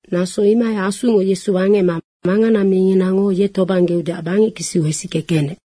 Naso imohai Asungo Yesu wangecma mangana minginango ye tobanggeudeac bangec kisiu hesicke kenec.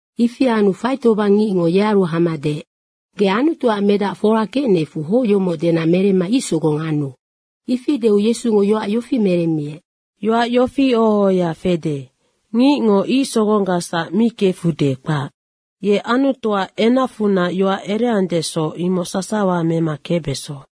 Ifi anu faitobang ngicngo yearu hama deec, “Ge Anutuac Medac fora kecnecfu hoc yomoc dena meremma ic sogong anu.” Ifi deu Yesungo yoac yofi meremmiec, “Yoac yofi oho ohoya fede, ‘Ngicngo ic sogonggacsac mi kefude, kpac. Ye Anutuac enacfunac yoac ereandesoc, imoc sasawa mema kecbeso.’”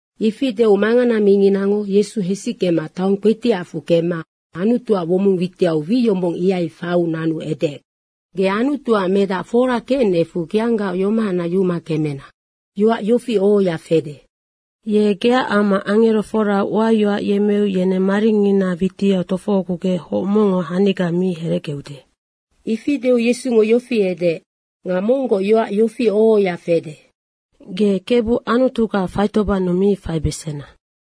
Ifi deu mangana minginango Yesu hesickema taong kpetiacfu kemma Anutuac womong witiau wi yombong, ihai faiu nanu edeec, “Ge Anutuac Medac fora kecnecfu geanggaoc yomohacnac yuma kemena. Yoac yofi oho ohoya fede, ‘Ye geac amma angerofora uayoac yemmeu yeneng maringina witiau tofohogugec hoc mongngo haniga mi herecgeude.’” Ifi deu Yesungo yofi edeec, “Nga monggoc yoac yofi oho ohoya fede, ‘Ge Kebu Anutuga faitobannu mi faibesena.’”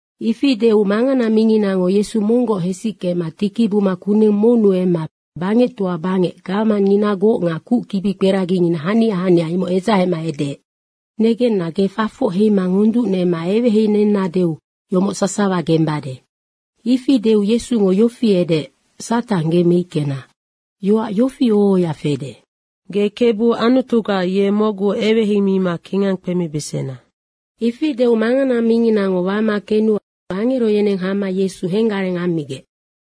Ifi deu mangana minginango Yesu monggoc hesickema tiki buma kuneng monnu emma bangectoa bangec gawamangnginagoc nga kuc kibikperagingina hania hania, imoc edzahema edeec, “Negenna, ge fafoc heima ngonducnema eweheinennadeu yomoc sasawa gembade.” ifi deu Yesungo yofi edeec, “Satang ge meickena. Yoac yofi oho ohoya fede, ‘Ge Kebu Anutuga, ye mocgu eweheimima kingang kpemibesena.’” Ifi deu mangana minginango wama kenu angero yeneng hama Yesu henggareng ammigec.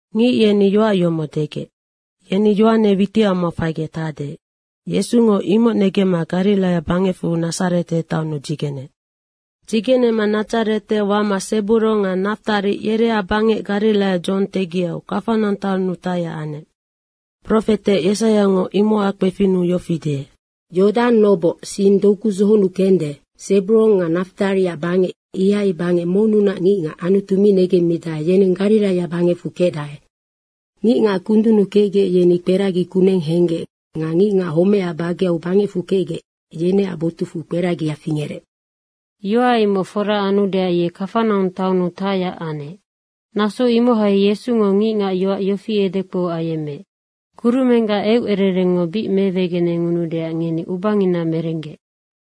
Ngic yeni yoac yomoc degec, “Yeni Yohane witicamau faigec tacde.” Yesungo imoc negemma Gariraia bangecfu Nadzarete taonnu dzigeneec. Dzigenema Nadzarete wama Seburong nga Naftari yereac bangec Gariraia dzohong tegiau, Kafanaung taonnu tacyac anec. Profete Yesaiango imocac kpefinnu yofi deec, “Yodang noboc sing doku dzohonnu kende, Seburong nga Naftariac bangec ihai bangec monnunac ngicngac Anutu mi negemmidae, yeneng Gariraia bangecfu kecdae. Ngicngac kundunnu kecgec, yeni kperagi kuneng henggec nga ngicngac homecac bageu bangecfu kecgec, yeneac botucfu kperagia fingerec.” Yoac imoc fora anudeac ye Kafanaung taonnu tacyac anec. Naso imohai Yesungo ngicngac yoac yofi edekpou ayemmeec, “Kurumenggac eucererengngo bic mewegenengudeac ngeni ubangina merenggec.”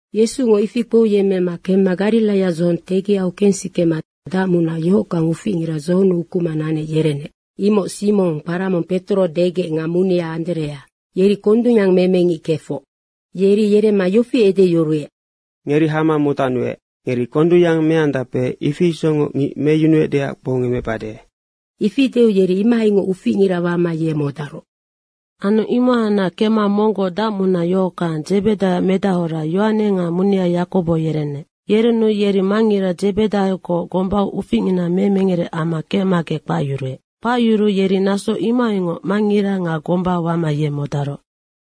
Yesungo ifi kpouyemmema kemma Gariraia dzohong tegiau kensikema dacmunac yohockang uficngira dzohonnu ukuma nanec yerenec. Imoc Simong, kpara mong Petoro degec nga munea Anderea. Yeri kondungyang meme ngic kefoc. Yeri yeremma yofi edeyuruec, “Ngeri hama modacnuec. Ngeri kondungyang meandape, ifi isocngoc ngic meyunuecdeac kpoungemecbade.” Ifi deu yeri imohaingoc uficngira wama ye modaroc. Anu imohacnac kemma monggoc dacmunac yohockang, Dzebedaioac medahora, Yohane nga munea Yakobo yerenec. Yerenu yeri mangngira Dzebedaiogoc gombau uficngina memengere amma kecmagec kpacyuruec. Kpacyuruu yeri naso imohaingoc mangngira nga gomba wama ye modaroc.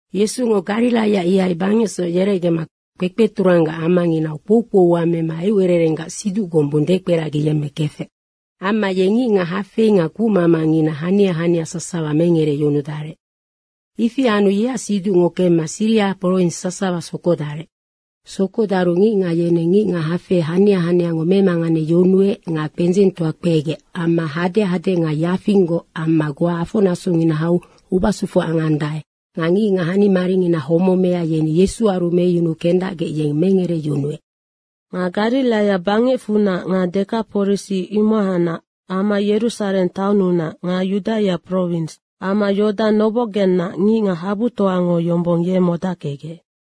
Yesungo Gariraia ihai bangecsoc yerecgema kpekpeturang amanginau kpoukpou ua mema eucererenggac siduc gombung dekperagiyemmekefec. Amma ye ngicngac hafei nga kucmamangina hania hania sasawa mengereyunudarec. Ifi anu yeac siducngo kemma Siria prowins sasawa sokodarec. Sokodaru ngicngac yeneng ngicngac hafei hania haniango memanganeyunuec nga kpendzengtoa kpegec amma hadehade nga yafinggoc amma goa afonasongina hau ubasufu angandae nga ngicngac hanimaringina homemea, yeni Yesuaru meyunu kendacgec yeng mengereyunuec. Nga Gariraia bangecfunac nga Dekaporisi, imohacnac amma Yerusareng taonnunac nga Yudaia prowins amma Yodang nobocgennac ngicngac habutoango yombong ye modackecgec.